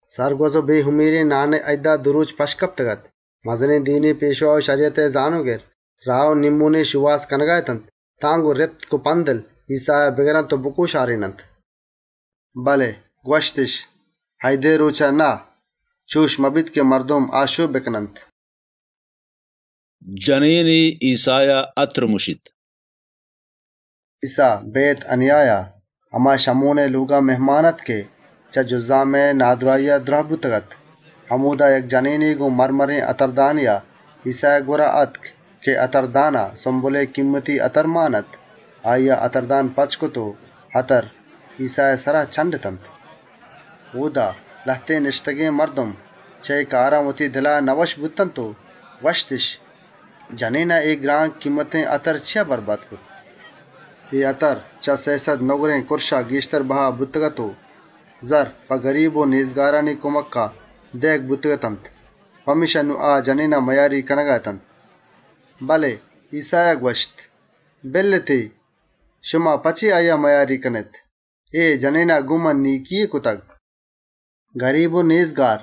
‏ سَرگوَز و بێهُمیرێن نانئے اییدا دو رۆچ پَشت کپتگ‌اَت، مزنێن دینی پێشوا و شَریَتئے زانۆگر، راه و نیمّۆنے شۆهاز کنگا اتنت تان گۆن رِپک و پَندَل، ایسّایا بگرنت و بکۆشارێننت. ‏ بله گوَشتِش: «اییدئے رۆچان نه، چُش مبیت که مردم آشۆپ بکننت.» جنێنے ایسّایا اَترَ مُشیت ‏ ایسّا، بئیت‌اَنیایا هما شَمونئے لۆگا مهمان اَت که چه جُزامئے نادْراهیا دْراه بوتگ‌اَت. همۆدا، یک جنێنے گۆن سِنگ‌مَرمَرێن اَتردانێا ایسّائے گوَرا آتک، اَتردانا سُمبلئے گهتر و گران‌بهاێن اَتر مان اَت. آییا اَتردان پَچ کرت و اَتر، ایسّائے سرا چَنڈتنت. ‏ اۆدا، لهتێن نِشتگێن مردم چه اے کارا وتی دلا نئوَشّ بوت و گوَشتِش: «چیا اے اَتر زئوال کنگ بوت؟ ‏ اے اَتر، چه سێسَد دینارا گێشترا بها بوتگ‌اَت و زرّ، گریب و نێزگاران دئیگ بوتگ‌اتنت.» پمێشکا، نون آ جنێنا مئیاریگ کنگا اتنت. ‏ بله ایسّایا گوَشت: «بِلّێتی، شما په چے اِشیا رَنجێنگا اێت؟ اے جنێنا گۆن من نێکیے کرتگ. ‏ گریب و نێزگار،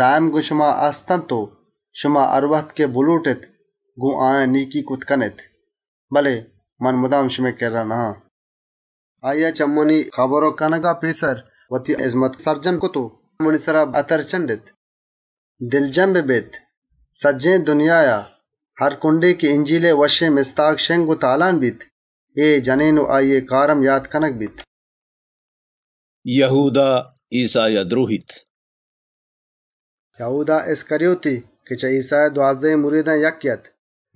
مُدام شمئے کرّا هست و شما هروهد که بلۆٹێت گۆن آیان نێکی کرتَ کنێت، بله من هروهد گۆن شما گۆن نه‌آن. ‏ آییا په منی کبر کنگئے تئیاریا، وتی هِزمت سرجم کرت و منی سرا اَتر چَنڈت. ‏ شمارا راستێنَ گوَشان، سجّهێن دنیایا، هر کُنڈے که منی وشّێن مستاگ جار جنَگَ بیت، اے جنێن و اِشیئے کار هم یات کنگَ بیت.» یَهودا ایسّایا دْرۆهیت ‏ یَهودا اِسْکَریوتی، که چه ایسّائے دوازدهێن مریدان یکّے اَت،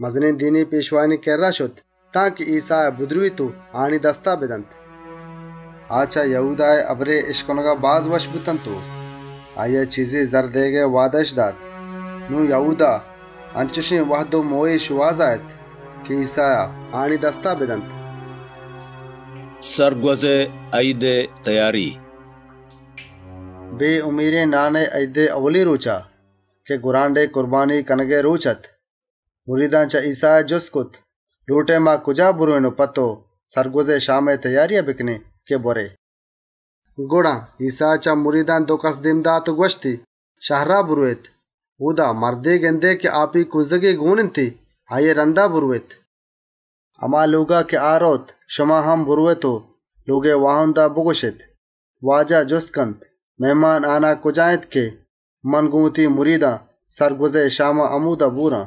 مزنێن دینی پێشوایانی کِرّا شت تانکه ایسّایا بدرۆهیت و آیانی دستا بدنت. ‏ آ چه یَهودائے هبرئے اِشکنگا باز وشّ بوتنت و لبزِش کرت آییا چیزے زَرّ بدئینت. نون، یَهودا گوَم و گێگێن وهد و مۆهێئے شۆهازا اَت که ایسّایا آیانی دستا بدنت. سَرگوَزئے اییدئے تئیاری ‏ بێهُمیرێن نانئے اییدئے ائولی رۆچا، که گوَرانڈئے کُربانیگ کنگئے رۆچ اَت، مریدان چه ایسّایا جُست کرت: «لۆٹئے ما کجا برئوێن و سَرگوَزئے اییدئے شامئے تئیاریا بکنێن که تئو بوَرئے؟» ‏ گڑا، ایسّایا چه مریدان دو کَس دێم دات و گوَشتی: «شهرا برئوێت، اۆدا مردے گندێت که آپی کونزگے گۆن اِنتی، آییئے رَندا برئوێت. ‏ هما لۆگا که آ رئوت، شما هم برئوێت و لۆگئے واهندا بگوَشێت: ‹استاد جُستَ کنت: مهمانهانه کجا اِنت که من گۆن وتی مریدان سَرگوَزئے شاما همۆدا بوَران؟› ‏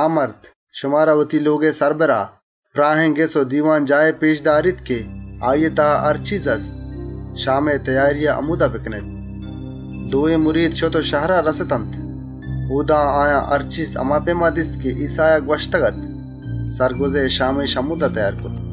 آ مرد، شمارا وتی لۆگئے سَربُرا، پْراهێن بان و دیوانجاهے پێشَ داریت که اۆدا هر چیز هست و تئیار اِنت، شامئے تئیاریا همۆدا بکنێت.» ‏ دوێن مرید شت و شهرا رَستنت. اۆدا، آیان هر چیز هما پئیما دیست که ایسّایا گوَشتگ‌اَت. سَرگوَزئے شامِش همۆدا تئیار کرت. ‏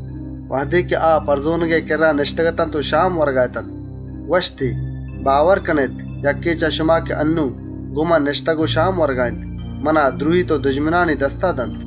وهدے پَرزۆنَگئے سرا نِشتگ‌اتنت و شام ورگا اتنت، گوَشتی: «باور کنێت، چه شما یکّے که انّون گۆن من نِشتگ و شام ورگا اِنت، منا دْرۆهیت و دژمنانی دستا دنت.» ‏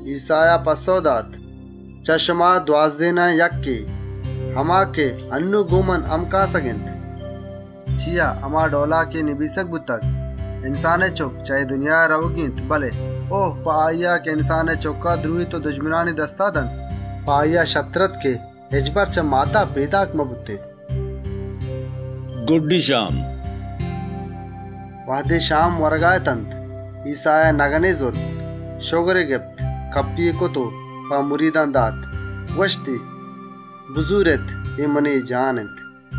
ایسّایا پَسّئو دات: «چه شما دوازدهێنان یکّے، هما که انّون گۆن من همکاسگ اِنت.» ‏ چیا که هما ڈئولا که نبیسگ بوتگ، انسانئے چُکّ چه اے دنیایا رئوگی اِنت، بله بَژن و اَپسۆز په هماییا که انسانئے چُکّا دْرۆهیت. په آییا شرتر اَت که هچبر چه ماتا پێدا مبوتێن. گُڈّی شام ‏ وهدے شام ورگا اتنت، ایسّایا نَگنے زرت، شگری گپت، چُنڈ چُنڈ کرت و مریدانا داتی. گوَشتی: «بزورێت! اے منی جسم اِنت.» ‏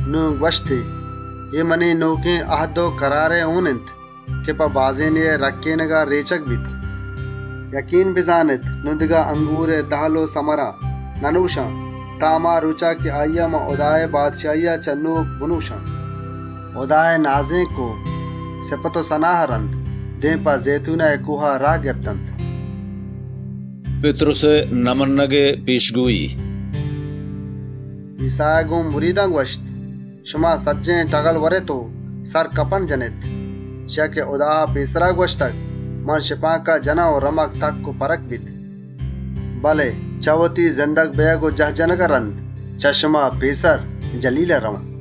نون گوَشتی: «اے منی نۆکێن اَهد و کَرارئے هۆن اِنت که په بازێنێا رێچگَ بیت. ‏ شمارا راستێنَ گوَشان، نون دگه برے انگورئے دَهل و سَمَرا ننۆشان تان هما رۆچا که هُدائے بادشاهیا پدا بنۆشانی.» ‏ هُدائے سِپَت و سَنایا رَند، دێم په زئیتونئے کۆها راه گپتنت. پِتْرُسئے اِنکارئے پێشگۆیی ‏ ایسّایا گۆن مریدان گوَشت: «شما سجّهێن ٹَگلَ ورێت و منا یلهَ کنێت. چیا که نبیسگ بوتگ: من شپانکا جنان و پس شِنگ و شانگَ بنت. ‏ بله زندگ بئیگ و جاه جنَگا رَند، چه شما پێسر جَلیلا رئوان.» ‏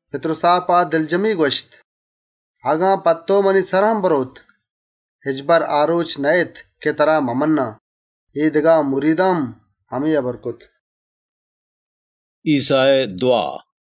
پِتْرُسا په دلجمی گوَشت: «اگن گۆن تئو منی سر هم برئوت، چه تئیی پَجّارا هچبرَ نبجّان.» اے دگه سجّهێن مریدان هم انچُش گوَشت. ایسّائے دْوا ‏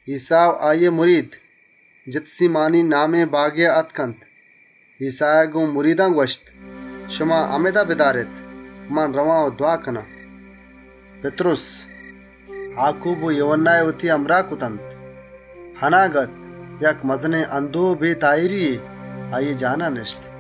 ایسّا و آییئے مرید، جِتسیمانی نامێن جاگهێا شتنت. گۆن آیان گوَشتی: «همِدا بدارێت، منَ رئوان و دْوا کنان.» ‏ پِتْرُس، آکوب و یوهَنّایی وتی همراه کرتنت. اَناگت، یک مزنێن اندۆه و بێتاهیریے آییئے جسم و جانا نِشت. ‏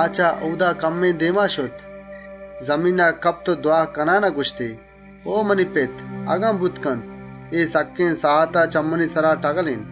چه اۆدا کمّے دێمترا شت، دێم په چێر کپت و دْوا کنان گوَشتی: «او منی پت! اگن بوتَ کنت، اے سکّێن ساهتا چه منی سرا بٹَگلێن.» ‏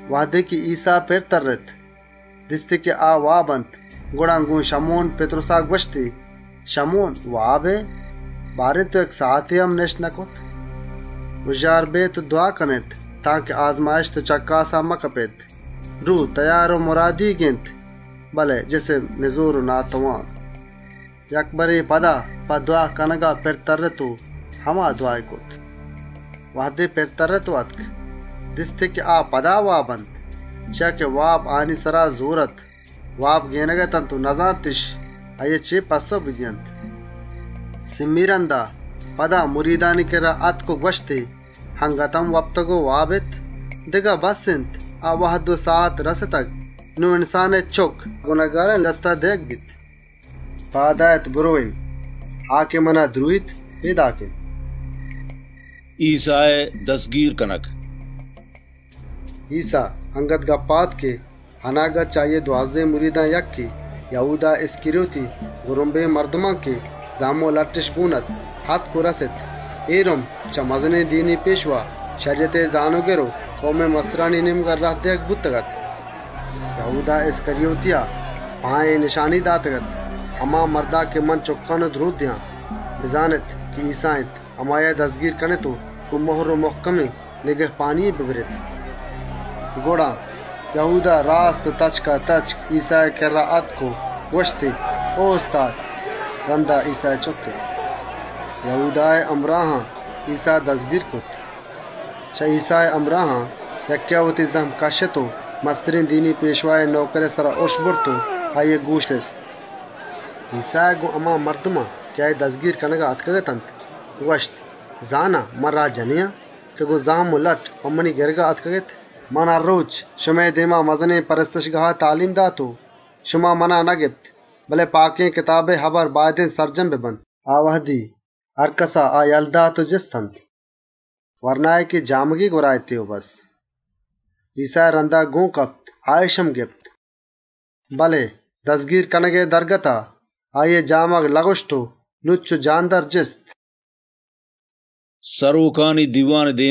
وهدے ایسّا پِر ترّت، دیستی که آ واب اَنت. گڑا گۆن شَمون پِتْرُسا گوَشتی: «شَمون! واب ائے؟ نبوت یک ساهتے هم آگاه بمانئے؟ ‏ هُژّار بێت و دْوا کنێت تانکه آزمایش و چَکّاسا مکپێت. روه، تئیار و مُرادیگ اِنت، بله جسم نِزۆر و ناتوان.» ‏ یک برے پدا په دْوا کنگا شت و هما دْوایی کرت. ‏ وهدے پِر ترّت، دیستی پدا واب اَنت. آیانی چمّ رُهێزگ و وابێنگ اتنت و نزانتِش آییا چے پَسّئو بدئینت. ‏ سئیمی رَندا، پدا مریدانی کِرّا آتک و گوَشتی: «اَنگت هم وپتگ و آرام کنگا اێت؟ بَسّ اِنت! آ وهد و ساهت رَستگ. نون انسانئے چُکّ درۆهگ و گنهکارانی دستا دئیگَ بیت. ‏ پاد آێت برئوێن! آ که منا درۆهیت، پێداک اِنت.» ایسّائے دَزگیر کنگ ‏ ایسّا اَنگت هبرا اَت که چه دوازدهێن مریدان یکّے، بزان یَهودا، آتک و رَست. آییا رُمبے مردم همراه اَت که زَهم و لَٹِّش گۆن اَت. اے رُمب، چه مزنێن دینی پێشوا، شَریَتئے زانۆگر و کئومئے کماشانی نێمگا راه دئیگ بوتگ‌اَت. ‏ یَهودایا آیانا اے نشانی داتگ‌اَت: «هماییا که منَ چُکّان، ایسّا هما اِنت. آییا دَزگیر کنێت و گۆن مُهر و مُهکمێن نِگهپانیے ببرێت.» ‏ گڑا، یَهودا تچکاتچک ایسّائے کِرّا آتک و گوَشتی: «او استاد!» رَندا، ایسّایی چُکِّت. ‏ یَهودائے همراهان ایسّا گپت و دَزگیر کرت. ‏ چه ایسّائے همراهان یکّێا وتی زَهم کَشّت و مسترێن دینی پێشوائے نئوکرئے سرا اُرُش برت و آییئے گۆشی سِست. ‏ ایسّایا گۆن هما مردمان که آییئے دَزگیر کنگا آتکگ‌اتنت، گوَشت: «زانا، من یاگی و رهزنے آن که گۆن زَهم و لَٹّان په منی گِرگا آتکگێت؟ ‏ من هر رۆچ، شمئے دێما مزنێن پرستشگاها درس و سَبک داتگ و شما منا نگپتگ. بله پاکێن کتابانی هبر باید اِنت سرجم ببنت.» ‏ آ وهدی، مریدان آ یله دات و جِستنت. ‏ ورنایے که جامگے گوَرا اَتی و بسّ، ایسّائے رَندا گۆن کپت، آاِش هم گپت. ‏ بله دَزگیر کنگئے وهدا، آییئے جامگ لَکُشت و جاندَرا تتک. ایسّا، سرۆکانی دیوانا ‏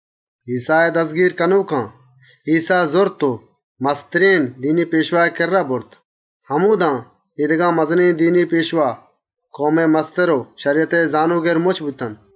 ایسّائے دَزگیر کنۆکان، ایسّا زرت و مسترێن دینی پێشوائے کِرّا برت، همۆدا اے دگه مزنێن دینی پێشوا، کئومئے کماش و شَریَتئے زانۆگر مُچّ اتنت. ‏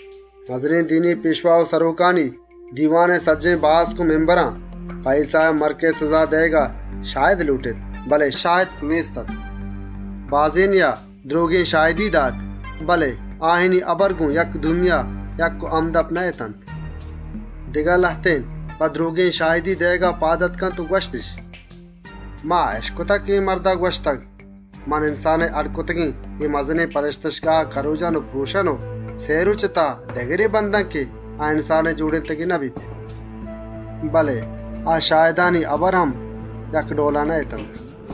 مزنێن دینی پێشوا و سرۆکانی دیوانئے سجّهێن باسک، په ایسّائے مَرکئے سِزا دئیگا شاهدیئے شۆهازا اتنت، بله شاهد نێست‌اَت. ‏ بازێنێا، درۆگێن شاهدی دات، بله آیانی هبر گۆن یکدومیا یکّ و همدَپ نه‌اتنت. ‏ دگه لهتێن، په درۆگێن شاهدی دئیگا پاد آتک و گوَشتِش: ‏ «ما اِشکتگ که اے مردا گوَشتگ: ‹من انسانئے اڈّ کرتگێن اے مزنێن پرستشگاها کرۆجان و پرۆشان و سئے رۆچئے تها یکّے بندان که انسانئے جۆڑێنتگێنَ نبیت.›» ‏ بله آ شاهدانی هبر هم یک ڈئولا نه‌اتنت. ‏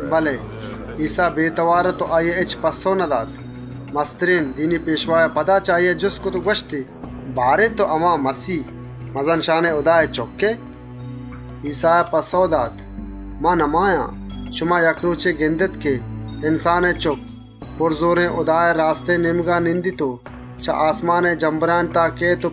بله ایسّا بێتئوار اَت و هچ پَسّئوے نداتی. مسترێن دینی پێشوایا پدا چه آییا جُست کرت و گوَشتی: «بارێن، تئو هما مَسیه، مَزَن‌شانێن هُدائے چُکّ ائے؟!» ‏ ایسّایا پَسّئو دات: «من هما آن، شما یک رۆچے گندێت که انسانئے چُکّ، زۆراورێن هُدائے راستێن نێمگا نِشتگ. چه آسمانئے جمبرانی تها هم کئیت.» ‏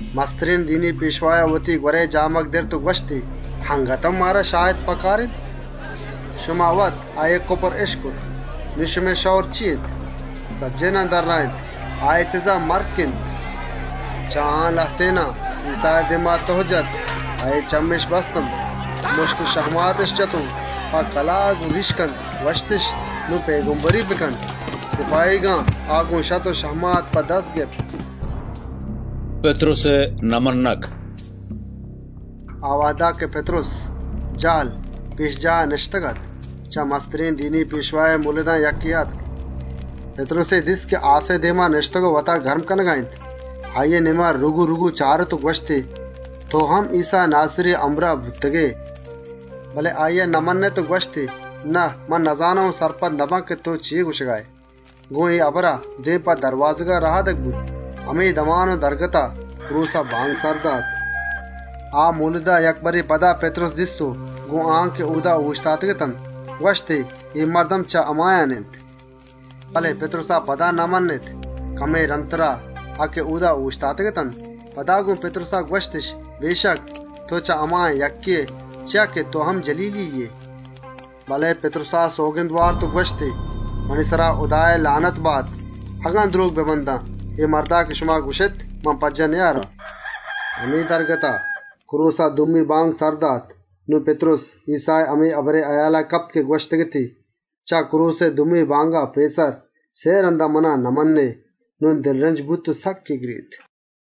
مسترێن دینی پێشوایا وتی گوَرئے جامگ دِرت و گوَشتی: «اَنگت هم مارا شاهد پکار اِنت؟ ‏ شما وت اِشیئے کُپر اِشکت. نون شمئے شئور و سَلاه چی اِنت؟» سجّهێنان درّاێنت: «اِشیئے سِزا مَرک اِنت.» ‏ چه آیان لهتێنا، ایسّائے دێما تُه کرت، آییئے چمِّش بستنت، مُشت و شَهماتِش جت و گوَشتِش: «نون پئیگمبری کن!» سپاهیگان، آ گپت و گۆن لَٹّ و شَهماتان مان بست. پِتْرُسئے اِنکار ‏ آ وهدا که پِتْرُس، جَهلا، پێشجاها نِشتگ‌اَت، چه مسترێن دینی پێشوائے مۆلدان یکّے آتک. ‏ پِتْرُسی دیست که آسئے دێما نِشتگ و وتا گرم کنگا اِنت. آییئے نێمگا رُگورُگو چارت و گوَشتی: «تئو هم ایسّا ناسِریئے همراه بوتگئے!» ‏ بله آییا نمَنِّت و گوَشتی: «نه، منَ نزانان و سرپدَ نبان که تئو چے گوَشگا ائے.» گۆن اے هبرا، دێم په دروازگا رهادگ بوت. همے دمان و درگتا، کرۆسا بانگ سر دات. ‏ آ مۆلدا یک برے پدا پِتْرُس دیست و گۆن آیان که اۆدا اۆشتاتگ‌اتنت، گوَشتی: «اے مرد هم چه همایان اِنت!» ‏ بله پِتْرُسا پدا نمَنِّت. کمّے رَندترا، آ که اۆدا اۆشتاتگ‌اتنت، پدا گۆن پِتْرُسا گوَشتِش: «اَلّما تئو چه همایان ائے، چیا که تئو هم جَلیلیے ائے.» ‏ بله پِتْرُسا سئوگند وارت و گوَشت: «منی سرا هُدائے نالَت بات اگن درۆگ ببندان. اے مردا که شما گوَشێت، منَ نزانان.» ‏ همے درگتا، کرۆسا دومی بانگ سر دات. نون پِتْرُس، ایسّائے هما هبرئے یات و تْرانگا کپت که گوَشتگ‌اَتی: «چه کرۆسئے دومی بانگا پێسر، سئے رَندا منی پَجّاه آرگا اِنکارَ کنئے.» نون دلرنج بوت و سکّ گرێتی.